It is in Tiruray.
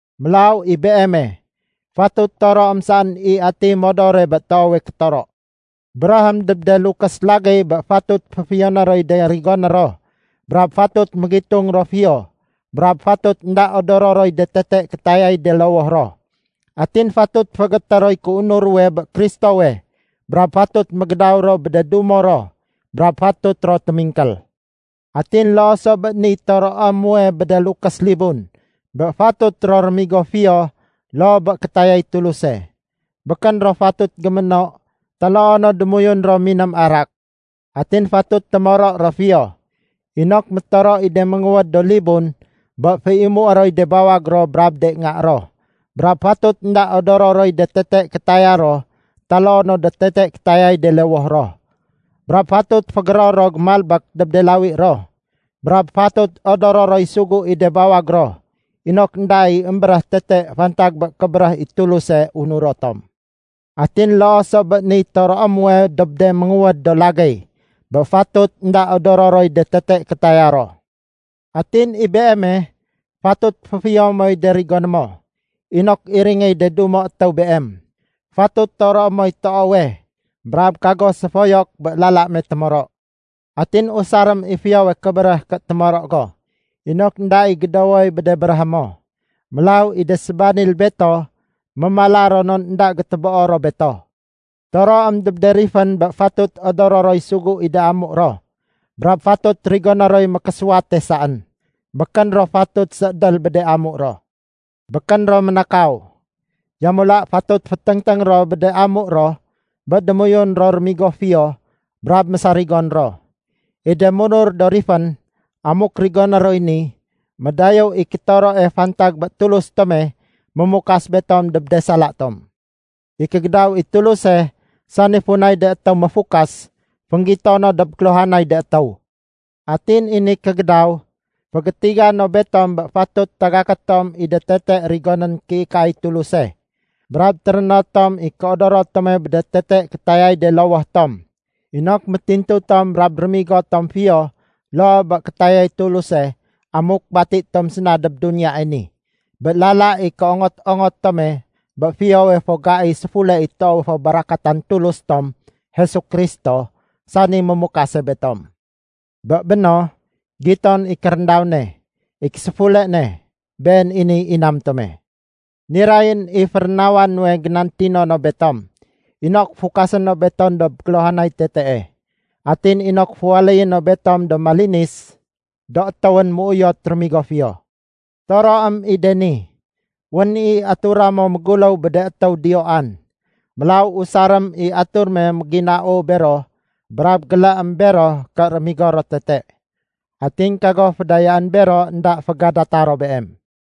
Mélaw i beeme, fatut toroém saén i atiy modore bé toowe kétoro. Béréhém dob de lukés lagéy bé fatut féfiyoné roy de rigoné ro brab fatut mégitung ro fiyo brab fatut énda odoro roy de tete kétayay de lowoh ro. Atin fatut féégété roy kéunur ruwe bé Kristowe, brab fatut mégédaw ro bé de dumo ro, brab fatut ro témingkél. Atin loo so bé niy toroé muwe bé de lukés libun bé fatut ro rémigo fiyo loo bé kétayay Tuluse. Békén ro fatut géméno, taloo no démoyun ro miném arak. Atin fatut témoro ro fiyo, inok métoro i de ménguwéd do libun bé féimué roy de bawag ro brab de nga ro, brab fatut énda odoro roy de tete kétaya ro taloo no de tete kétayay de lowoh ro. Brab fatut fégéror ro gémalbék dob de lawi ro, brab fatut odoro roy sugu i de bawag ro, inok énda i émbéréh tete fantag bé kébéréh i Tuluse unuro tom. Atin loo so bé niy toroé muwe dob de ménguwéd do lagéy bé fatut énda odoro roy de tete kétaya ro. Atin i beeme, fatut féfiyo moy de rigoné mo, inok iringéy de dumo étéw beem. Fatut toroé moy toowe, brab kago séfoyok bé lala me témoro. Atin usarém i fiyowe kébéréh ké témoro go inok énda i gédowoy bé de béréhé mo. Mélaw i de sébanil beto mémala ro non énda gétéboo ro beto. Toroém dob de rifén bé fatut odoro roy sugu i de amu ro brab fatut rigoné roy mékésuwate saén. Békén ro fatut séédél bé de amu ro. Békén ro ménakaw. Yamula, fatut féténgténg ro bé de amu ro bé démoyun ro rémigo fiyo brab mésarigon ro. I de munur do rifén, amuk rigoné roy ni, médayéw i kétoroe fantag bé Tulus tome mémukas betom dob de sala tom. I kégédaw i Tuluse, sani funay de étéw méfukas, fénggito no dob kéluhanay de étéw. Atin i ni kégédaw, fégétiga no betom bé fatut tagaké tom i de tete rigonén kéikaay Tuluse, brab téréno tom i kéodoro tome bé de tete kétayay de lowoh tom, inok métintu tom brab rémigo tom fiyo loo bé kétayay Tuluse amuk bati tom séna dob duniyae ni, bé lala i kéongot-ongot tome bé fiyowe fo gai séfule i toowe fo barakatan Tulus tom Jesu Kristo, sani mémukase betom. Bé béno, giton i kéréndaw ne. I késéfule ne, been i niy inam tome. Nirayén i férénawa nuwe génantino no betom inok fukasé no betom dob kéluhanay tetee. Atin inok féwaléyé no betom do malinis do étéwén méuyot rémigo fiyo. Toroém i de ni. Wén i atura mo méguléw bé de étéw diyoan. Mélaw usarém i atur me méginau bero brab géléém bero ké rémigo ro tete. Atin kago fédayaén bero énda fégadata ro beem.